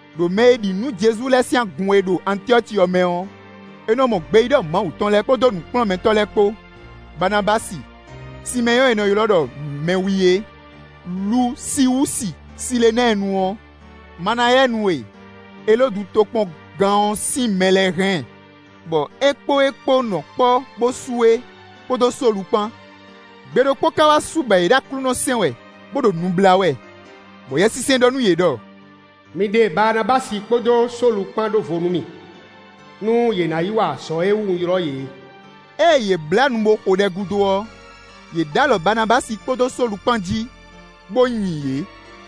Đo mɛ e ɖi nǔ nú Jezu lɛ́ɛ sín agun e ɖo Antyɔ́ci ɔ́ mɛ ɔ́, è nɔ mɔ gbeyíɖɔ Mawu tɔn lɛ́ɛ, kpódó nǔkplɔ́nmɛtɔ́ lɛ́ɛ kpó: Baanabási, Simɛ́nyɔ́ɔ e è nɔ ylɔ́ ɖɔ Mɛwi é, Lusiwúsi Silenɛ́ɛnu ɔ́, Manayɛnu e Elódu tokpɔngán ɔ́ sín mɛ lɛ́ɛ hɛn, bɔ é kpó é kpó nɔ kpɔ́ bó su é, kpódó Sólu kpán. Gbe ɖokpó ka wá su bɔ yě ɖo Aklúnɔ sɛn wɛ, bó ɖo nu blá wɛ, bɔ Yɛsinsɛn ɖɔ nú yě ɖɔ: “Mi ɖe Baanabási kpódó Sólu kpán ɖó vo nú mì, nú yě ná yi wa azɔ̌ e wú un ylɔ́ yě é.” Ée yě blá nu bó xo ɖɛ gúdo ɔ́, yě ɖǒ alɔ Baanabási kpódó Sólu kpán jí, bó nyi yě.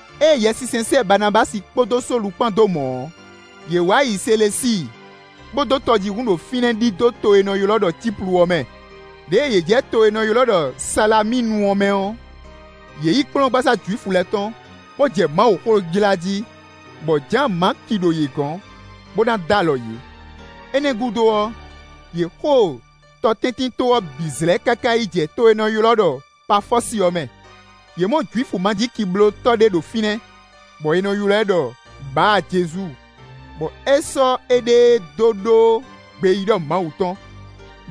Ée Yɛsinsɛn sɛ́ Baanabási kpódó Sólu kpán dó mɔ̌ ɔ́, yě wá yi Selesíi, bó dó tɔjíhún ɖo fínɛ́ ɖidó to e è nɔ ylɔ́ ɖɔ Cíplu ɔ́ mɛ. Đěe yě jɛ to e è nɔ ylɔ́ ɖɔ Salamínu ɔ́ mɛ ɔ́, yě yi kplɔ́ngbasá Jwifu lɛ́ɛ tɔn, bó jɛ Mawuxó jlá jí, bɔ Jǎan-Maki ɖo yě gɔ́n, bó ná dó alɔ yě. Énɛ́ ɔ́ gúdo ɔ́, yě xo tɔtɛ́ntinto ɔ́ bǐ zlɛ́ káká yi jɛ to e è nɔ ylɔ́ ɖɔ Pafɔ́si ɔ́ mɛ; yě mɔ Jwifu majíkiblótɔ́ ɖé ɖo fínɛ́, bɔ è nɔ ylɔ́ ɛ ɖɔ Báa-Jezu, bɔ é sɔ́ éɖée dó ɖó gbeyíɖɔ Mawu tɔn.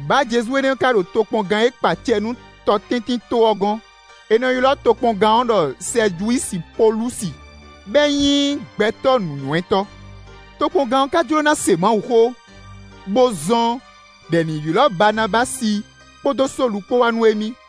Báa-Jezu énɛ́ ka ɖo tokpɔngán e kpa acɛ nú tɔtɛ́ntinto ɔ́ gɔ́n; è nɔ ylɔ́ tokpɔngán ɔ́ ɖɔ Sɛjiwusi Polúsi, bɔ é nyí gbɛtɔ́ nǔnywɛ́tɔ́. Tokpɔngán ɔ́ ka jló ná se Mawuxó, bó zɔ́n ɖɔ è nǐ ylɔ́ Baanabási kpódó Sólu kpó wá nú émí;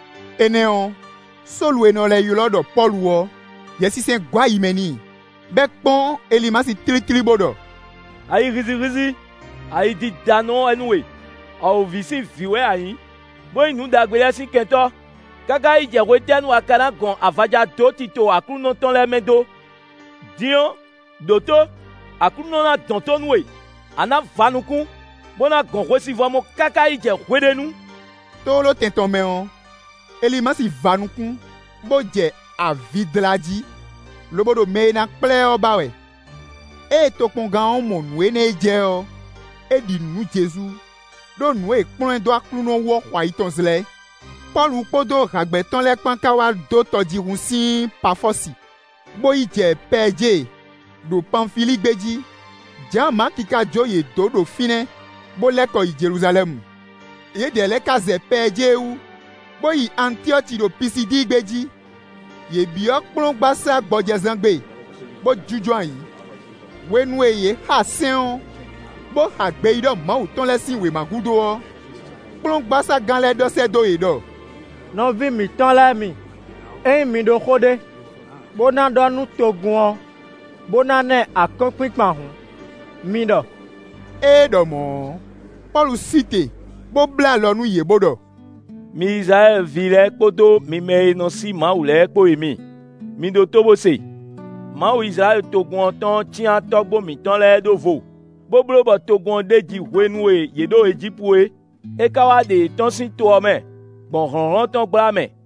Énɛ́ ɔ́, Sólu e è nɔ lɛ́ ylɔ́ ɖɔ Pɔ́lu ɔ́, Yɛsinsɛn gɔ́ ayi mɛ n'i, bɔ é kpɔ́n Elimasi tlítlí, bó ɖɔ: “Ayi hízíhízí, ayidídánɔ wɛ nú we; awǒvi sín vǐ wɛ a nyǐ, bó nyí nǔ ɖagbe lɛ́ɛ sín kɛntɔ́; káká yi jɛ hwetɛ́nu a ka ná gɔn avaja dó tito Aklúnɔ tɔn lɛ́ɛ mɛ dó? Din ɔ́, ɖǒtó! Aklúnɔ ná dɔn tó nú we; a nǎ va nukún, bó ná gɔn hwesivɔ́ mɔ káká yi jɛ hwe ɖé nu.” Tlóló tɛn tɔn mɛ ɔ́, Elimasi va nukún, bó jɛ avi dlá jí, lobo ɖo mɛ e ná kplá ɛ ɔ́ ba wɛ. Ée tokpɔngán ɔ́ mɔ nǔ énɛ́ e jɛ ɔ́, é ɖi nǔ nú Jezu, ɖó nǔ e è kplɔ́n ɛ dó Aklúnɔ wú ɔ́ xo ayi tɔn zlɛ́. Pɔ́lu kpódó hǎgbɛ́ tɔn lɛ́ɛ kpán ka wá dó tɔjíhún sín Pafɔ́si, bó yi jɛ Pɛɛjée ɖo Panfilíi gbé jí. Jǎan-Maki ka jó yě dó ɖo fínɛ́, bó lɛ́ kɔ yi Jeluzalɛ́mu. Yědɛɛ lɛ́ɛ ka zɛ Pɛɛjée wú, bó yi Antyɔ́ci ɖo Pisidíi gbé jí; yě byɔ́ kplɔ́ngbasá gbɔjɛzán gbe, bó jínjɔ́n ayǐ. Hwenu e yě xa sɛ́n ɔ́, bó xa gbeyíɖɔ Mawu tɔn lɛ́ɛ sín wěma gúdo ɔ́, kplɔ́ngbaságán lɛ́ɛ ɖɔ sɛ́ dó yě ɖɔ: “Nɔví mǐtɔn lɛ́ɛ mi, ényí mi ɖó xó ɖé, bó ná ɖɔ nú togun ɔ́, bó dó ná ɛ akɔ́nkpinkpan hǔn, mi ɖɔ.” Ée é ɖɔ mɔ̌ ɔ́, Pɔ́lu sí te, bó bló alɔ nú yě, bó ɖɔ: “Mi Izlayɛ́li ví lɛ́ɛ kpódó mi mɛ e nɔ sí Mawu lɛ́ɛ kpó e mi, mi ɖótó bó se. Mawu Izlayɛ́li togun ɔ́ tɔn ɔ́ cyán tɔ́gbó mǐtɔn lɛ́ɛ ɖó vo, bó bló bɔ togun ɔ́ ɖeji hwenu e yě ɖo Ejípu é; é ka wá ɖe yě tɔ́n sín to ɔ́ mɛ, gbɔn hlɔ̌nhlɔ́n tɔn gbla mɛ,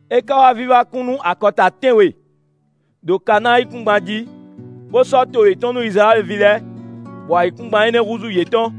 É ka wá vívá kún nú akɔta tɛ́nwe, ɖo Kanáa yíkúngban jí, bó sɔ́ to yětɔn nú Izlayɛ́li ví lɛ́ɛ, bɔ ayǐkúngban énɛ́ húzú yětɔn.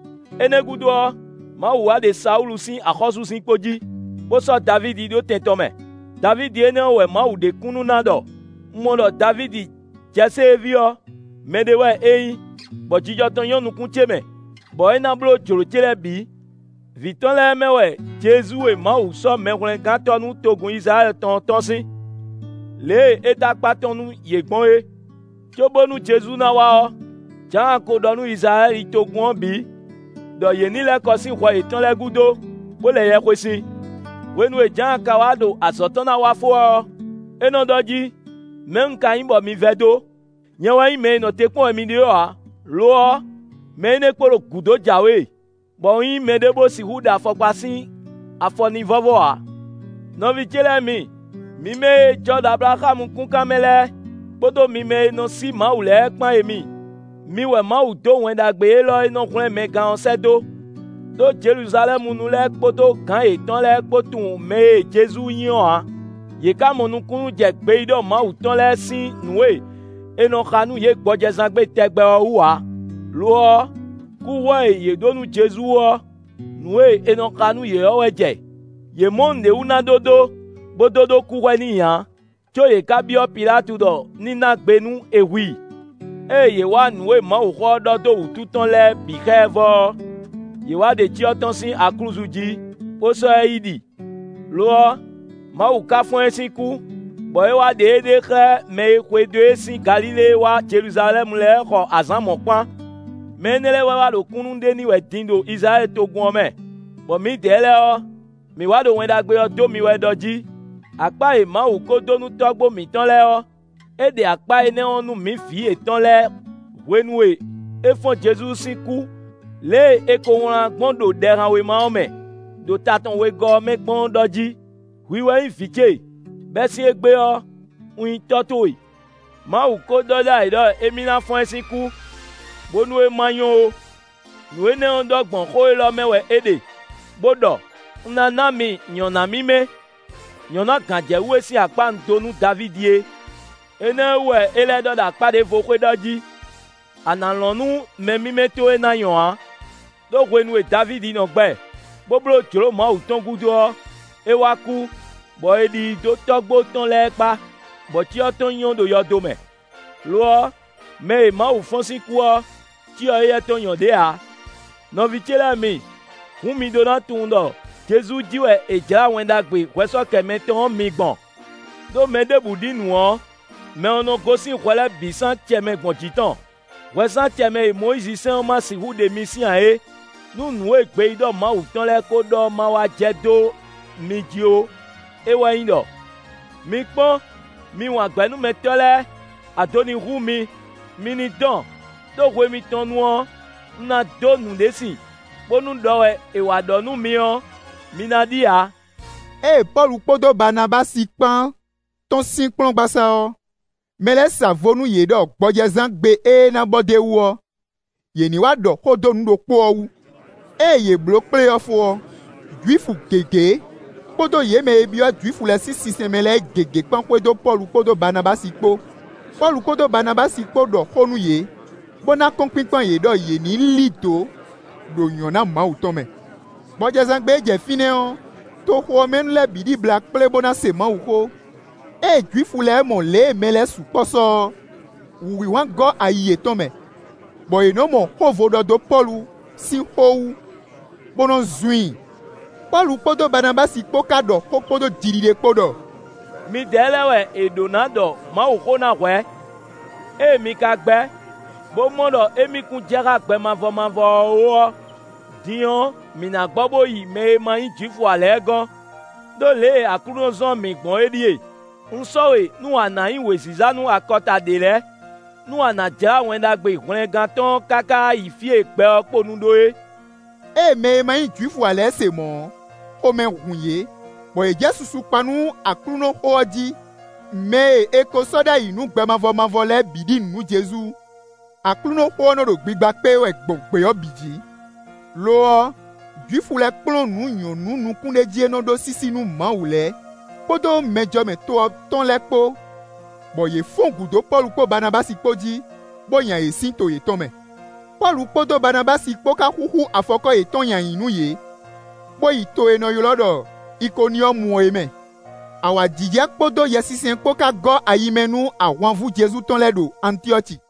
Énɛ́ gúdo ɔ́, Mawu wá ɖe Sawúlu sín axɔ́súzinkpo jí, bó sɔ́ Davídi ɖó tɛn tɔn mɛ. Davídi énɛ́ ɔ́ wɛ Mawu ɖe kúnnu ná ɖɔ: ‘Un mɔ ɖɔ Davídi Jɛsée ví ɔ́, mɛɖé wɛ é nyí, bɔ jijɔ tɔn nyɔ́ nukún ce mɛ, bɔ é ná bló jlǒ ce lɛ́ɛ bǐ.’ Vǐ tɔn lɛ́ɛ mɛ wɛ Jezu e Mawu sɔ́ Mɛhwlɛ́ngántɔ́ nú togun Izlayɛ́li tɔn ɔ́ tɔ́n sín, lě e é dó akpá tɔn nú yě gbɔn é. Cóbónú Jezu ná wá ɔ́, Jǎan ko ɖɔ nú Izlayɛ́li togun ɔ́ bǐ ɖɔ yě ní lɛ́ kɔ sín hwɛ yětɔn lɛ́ɛ gúdo, bó lɛ yɛhwesin. Hwenu e Jǎan ka wá ɖo azɔ̌ tɔn ná wa fó wɛ ɔ́, é nɔ ɖɔ jí: ‘Mɛ̌ un ka nyí bɔ mi vɛdó? Nyɛ wɛ nyí mɛ e nɔ te kpɔ́n wɛ mi ɖe ɔ́ ǎ; lo ɔ́, mɛ énɛ́ kpo ɖo gǔdo jǎwe, bɔ un nyí mɛɖé bó sixú ɖe afɔkpa sín afɔ n'i vɔ́vɔ́ ǎ.’ “Nɔví ce lɛ́ɛ mi, mi mɛ e jɔ ɖo Ablaxámu kúnkan mɛ lɛ́ɛ, kpódó mi mɛ e nɔ sí Mawu lɛ́ɛ kpán e mi; mi wɛ Mawu dó Wɛn Ɖagbe élɔ́ e nɔ hwlɛ́n mɛ gán ɔ́ sɛ́ dó. Đó Jeluzalɛ́munu lɛ́ɛ kpódó gǎn yětɔn lɛ́ɛ kpó tunwun mɛ e Jezu nyí ɔ́ ǎ; yě ka mɔ nukúnnú jɛ gbeyíɖɔ Mawu tɔn lɛ́ɛ sín nǔ e è nɔ xa nú yě gbɔjɛzán gbe tɛgbɛ ɔ́ wú ǎ; lo ɔ́, kúhwɛ e yě ɖǒ nú Jezu ɔ́, nǔ e è nɔ xa nú yě ɔ́ wɛ jɛ. Yě mɔ nǔɖé wú ná ɖó dó, bó dó ɖó kúhwɛ n'i ǎ, có yě ka byɔ́ Pilátu ɖɔ ní ná gbe nú è hu i. Ée yě wa nǔ e Mawuxó ɔ́ ɖɔ dó wútu tɔn lɛ́ɛ bǐ xá ɛ vɔ ɔ́, yě wá ɖe cyɔ tɔn sín aklúzu jí, bó sɔ́ ɛ yi ɖi. Lo ɔ́, Mawu ka fɔ́n ɛ sín kú, bɔ é wá ɖe éɖée xlɛ́ mɛ e xwedó e sín Galilée wá Jeluzalɛ́mu lɛ́ɛ xɔ azǎn mɔ̌kpán. Mɛ énɛ́ lɛ́ɛ wɛ wá ɖo kúnnu ɖe n'i wɛ din ɖo Izlayɛ́li togun ɔ́ mɛ, bɔ mǐdɛɛ lɛ́ɛ ɔ́, mǐ wá ɖo Wɛn Ɖagbe ɔ́ dó mi wɛ ɖɔ jí: akpá e Mawu ko dó nú tɔ́gbó mǐtɔn lɛ́ɛ ɔ́, é ɖe akpá énɛ́ ɔ́ nú mǐ vǐ yětɔn lɛ́ɛ hwenu e é fɔ́n Jezu sín kú lě e è ko wlán gbɔn ɖo Ɖɛhanwéma ɔ́ mɛ, ɖo ta tɔn wegɔ́ ɔ́ mɛ gbɔn ɔ́ ɖɔ jí: ‘Hwi wɛ nyí Vǐ ce; bɛ́ sín égbé ɔ́, un nyí Tɔ́ towe.’ Mawu ko ɖɔ ɖ'ayǐ ɖɔ émí ná fɔ́n ɛ sín kú, bónú é ma nyɔ ó. Nǔ énɛ́ ɔ́ ɖɔ gbɔn xó élɔ́ mɛ wɛ é ɖe, bó ɖɔ: ‘Un ná ná mi nyɔ̌ná mímɛ́; nyɔ̌ná gǎnjɛwú e sín akpá un dó nú Davídi é.’ Énɛ́ wú wɛ é lɛ́ ɖɔ ɖo akpá ɖěvo xwé ɖɔ jí: ‘A nǎ lɔn nú mɛ mímɛ́ towe ná nyɔ ǎ.’ Đó hwenu e Davídi nɔ gbɛ, bó bló jlǒ Mawu tɔn gúdo ɔ́, é wá kú, bɔ è ɖi i dó tɔ́gbó tɔn lɛ́ɛ kpá, bɔ cyɔ tɔn nyɔ ɖo yɔdo mɛ. Lo ɔ́, mɛ e Mawu fɔ́n sín kú ɔ́, cyɔ éyɛ́ tɔn nyɔ ɖě ǎ. Nɔví ce lɛ́ɛ mi, hǔn mi ɖó ná tunwun ɖɔ Jezu jí wɛ è jlǎ Wɛn Ɖagbe hwɛsɔ́kɛmɛ tɔn ɔ́ mi gbɔn. Đó mɛ ɖěbǔ ɖi nǔ ɔ́, mɛ ɔ́ nɔ́ gosín hwɛ lɛ́ɛ bǐ sín acɛ mɛ gbɔn jǐ tɔn; hwɛ sín acɛ mɛ e Mɔyízi sɛ́n ɔ́ ma sixú ɖe mi sín ǎ é; nú nǔ e gbeyíɖɔ Mawu tɔn lɛ́ɛ ko ɖɔ ɔ́ má wá jɛ dó mi jí ó; é wɛ nyí ɖɔ: ‘Mi kpɔ́n, mi wǎngbɛ́númɛtɔ́ lɛ́ɛ; ado ní hu mi, mi ní dɔn; ɖó hwe mitɔn nu ɔ́, un ná dó nǔɖé sin, bónú ɖɔ wɛ è wá ɖɔ nú mi ɔ́, mi ná ɖi ǎ.’” Ée Pɔ́lu kpódó Baanabási kpán tɔ́n sín kplɔ́ngbasá ɔ́, mɛ lɛ́ɛ sa vo nú yě ɖɔ gbɔjɛzán gbe ée ná bɔ d'é wú ɔ́, yě ní wá ɖɔ xó dó nǔ ɖokpó ɔ́ wú. Ée yě bló kplé ɔ́ fó ɔ́, Jwifu gěgé, kpódó yě mɛ e byɔ́ Jwifu lɛ́ɛ sín sinsɛn mɛ lɛ́ɛ gěgé kpán xwedó Pɔ́lu kpódó Baanabási kpó. Pɔ́lu kpódó Baanabási kpó ɖɔ xó nǔ yě, bó ná akɔ́nkpinkpan yě ɖɔ yě ní lí dǒ ɖo nyɔ̌ná Mawu tɔn mɛ. Gbɔjɛzán gbe e jɛ fínɛ́ ɔ́, toxo ɔ́ mɛ nu lɛ́ɛ bǐ ɖibla kplé bó ná se Mawuxó. Ée Jwifu lɛ́ɛ mɔ lě e mɛ lɛ́ɛ sukpɔ́ sɔ ɔ́, wǔhwinhwan gɔ́ ayi yětɔn mɛ, bɔ yě nɔ́ mɔ xó vo ɖɔ dó Pɔ́lu sín xó wú, bó nɔ zun i. Pɔ́lu kpódó Baanabási kpó ka ɖɔ xó kpódó jiɖiɖe kpó ɖɔ: “Midɛɛ lɛ́ɛ wɛ è ɖǒ ná ɖɔ Mawuxó ná hwɛ̌; ée mi ka gbɛ́, bó mɔ ɖɔ émí kún jɛ xá gbɛ mavɔ mavɔ ɔ́ ó ɔ́, din ɔ́, mǐ ná gbɔ bó yi mɛ e má nyí Jwifu ǎ lɛ́ɛ gɔ́n. Đó lě e Aklúnɔ zɔ́n mǐ gbɔn é ɖíe: ‘Un sɔ́ we nú a nǎ nyí wěziza nú akɔta ɖě lɛ́ɛ, nú a nǎ jlá Wɛn Ɖagbe hwlɛngán tɔn ɔ́ káká yi fí e gbɛ ɔ́ kponu ɖó é.’” Ée mɛ e ma nyí Jwifu ǎ lɛ́ɛ se mɔ̌ ɔ́, xomɛ hun yě, bɔ yě jɛ susu kpa nú Aklúnɔxó ɔ́ jí; mɛ e è ko sɔ́ ɖ'ayǐ nú gbɛ mavɔ mavɔ lɛ́ɛ bǐ ɖi nǔ nú Jezu. Aklúnɔxó ɔ́ nɔ ɖo gbigba kpé wɛ gbɔn gbě ɔ́ bǐ jǐ. Lo ɔ́, Jwifu lɛ́ɛ kplɔ́n nǔ nyɔ̌nu nukúnɖéjí e nɔ ɖó sísí nú Mawu lɛ́ɛ kpódó mɛjɔmɛ to ɔ́ tɔn lɛ́ɛ kpó, bɔ yě fɔ́n gǔ dó Pɔ́lu kpódó Baanabási kpó jí, bó nya yě sín to yětɔn mɛ. Pɔ́lu kpódó Baanabási kpó ka xúxú afɔkɔ́ yětɔn kɔn nyi ayǐ nú yě, bó yi to e è nɔ ylɔ́ ɖɔ Ikoniyɔ́mu é mɛ. Awǎjijɛ kpódó Yɛsinsɛn kpó ká gɔ́ ayi mɛ nú ahwanvú Jezu tɔn lɛ́ɛ ɖo Antyɔ́ci.